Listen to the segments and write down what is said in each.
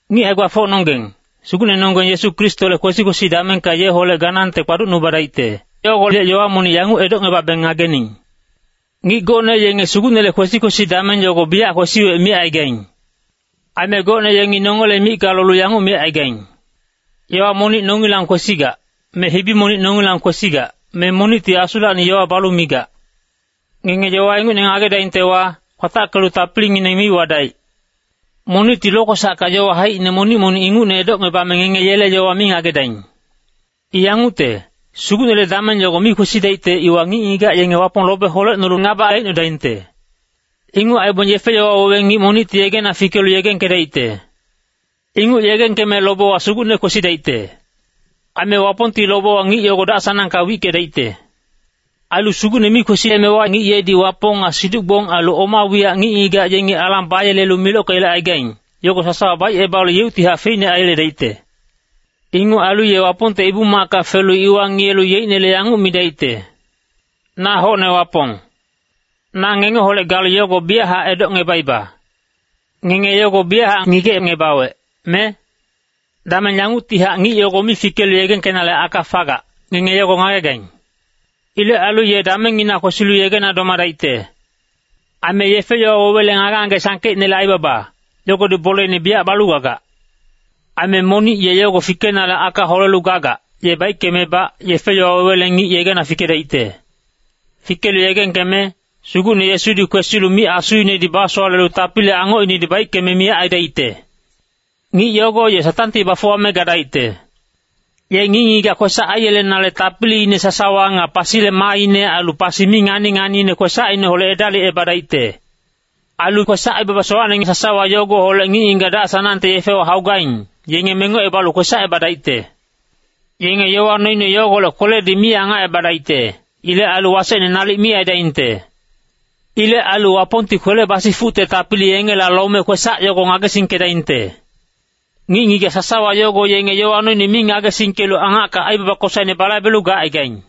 Ngic hae-gbafocnonggeng, Sugucnenonggeng Yesu Kristole kwesi-kwesi damengka yeholec ganangte kpaducnubadaicte, yogolec yowa monic yanguc edocngebabeng ngagening. Ngic gocne yenge Sugucnele kwesi-kwesi dameng yogo biyac kwesiwec micaigaing. Aime gocne yengi nongele micka lolu yanguc micaigaing, “Yowa monic nongilang kwesigac, me hibi monic nongilang kwesigac, me monicti Asulacni yowa balu migac.” Ngenge yowa ingucne ngagedaingtewa, kwatackelu tapilingineng mi wadaic. Monicti lokwesacka yowa haicine monic-monic ingucne edocngebame ngenge yele yowa mi ngagedaing. I yangucte, Sugucnele dameng yogo mi kwesidaicte iwa ngic-ngigac yenge Wapong lobe holecnolu ngaba aicnodaingte. Inguc aibong yefe-yowa wewe ngic monicti yegena fikelu yegengkedaicte. Inguc yegengkeme lobewa Sugucne kwesidaicte. Aime Wapongti lobewa ngic yogo dac-sanangka wickedaicte. Ailu Sugucne mi kwesiyemewa ngic yedi Wapong nga siduc-gbong ailu oma wiyac ngic-ngigac yengi alang bayelelu milockeyelecaigaing, yogo sasawa baicebalu yeuctihac feicne aiyeledaicte. Inguc ailu ye Wapongte Ibu-macka felu iwa ngiyelu yeicnele yanguc midaicte, “Na hocne Wapong.” Na ngengeholec galu yogo biyachac edocngebaiba. Ngenge yogo biyachac ngigecngebawec, me? Dameng yanguctihac ngic yogo mi fikelu yegengkenale aka fagac, ngenge yogo ngagegaing. Ilec ailu ye damengngina kwesilu yegena domadaicte. Aime yefe-yowa wewele ngage-ngage sangkeicnele aibaba, yogodi boleine biyac balu gagac. Aime monic ye yogo fikenale aka holelu gagac, ye baickemebac, yefe-yowa wewele ngic yegena fikedaicte. Fikelu yegengkeme, Sugucne Yesudi kwesilu mic-asuinedi basowalelu tapili angocinedi baickeme miyac aidaicte. Ngic yogo ye Satangti bafuwame gadaicte. Ye ngic-ngigac kwesac aiyelenale tapiliine sasawa nga pasile maaine ailu pasi mi ngani-nganiine kwesacineholec edalicebadaicte. Ailu kwesac-aibaba sowacne sasawa yogoholec ngic-ngigac dac-sanangte yefewa haugaing, yenge mengocebalu kwesacebadaicte. Yenge yowa noine yogolec kweledi mi angacebadaicte. Ilec ailu wasecne nalic mi aidaingte. Ilec ailu Wapongti kwele basifucte tapili yengela lome kwesac yogo ngagesingkedaingte. Ngic-ngigac sasawa yogo yenge yowa noine mi ngagesingkelu angacka aibaba kosaine balaibelu gacaigaing.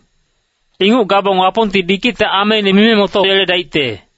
Inguc gabong Wapongti bikicte ameine mime motoyeledaicte.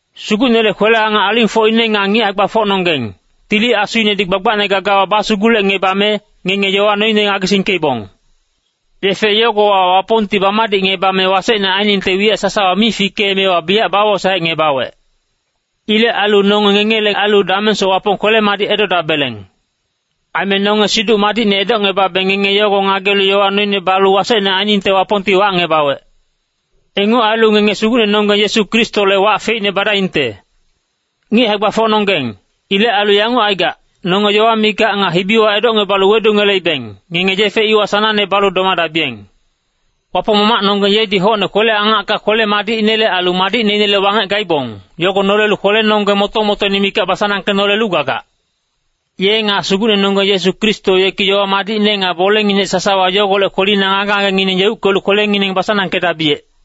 Sugucnele kwele-angac alingfocine nga ngic hae-gbafocnonggeng, Tili Asuinedi gbagbacne gagawa basugulecngebame, ngenge yowa noine ngagesingkeibong. Yefe yogowa Wapongti bamadicngebame wasecne ainingte wiyac sasawa mi fikeemewa biyac bawosaecngebawec. Ilec ailu nonge ngengele ailu damengsoc Wapong kwele-madic edodabeleng. Aime nonge Siduc Madicne edocngebabeng ngenge yogo ngagelu yowa noine balu wasecne ainingte Wapongti wacngebawec. Inguc ailu ngenge Sugucnenonggeng Yesu Kristole wac feicne badaingte. Ngic hae-gbafocnonggeng, ilec ailu yanguc aigac, nonge yowa micka nga hibiwa edocngebalu wedungeleibeng, ngenge yefe iwa sanangne balu domadabiyeng. Wapong Mamacnonggeng yedi hocne kwele-angacka kwele-madicinele ailu madicneinele wangec gaibong, yogo nolelu kwelenonggeng moto-motoine mikac basanangkenolelu gagac. Ye nga Sugucnenonggeng Yesu Kristo yeki yowa madicne nga bolenginec sasawa yogolec kwelina ngage-ngagengineng yeuckelu kwelengineng basanangkedabiyec.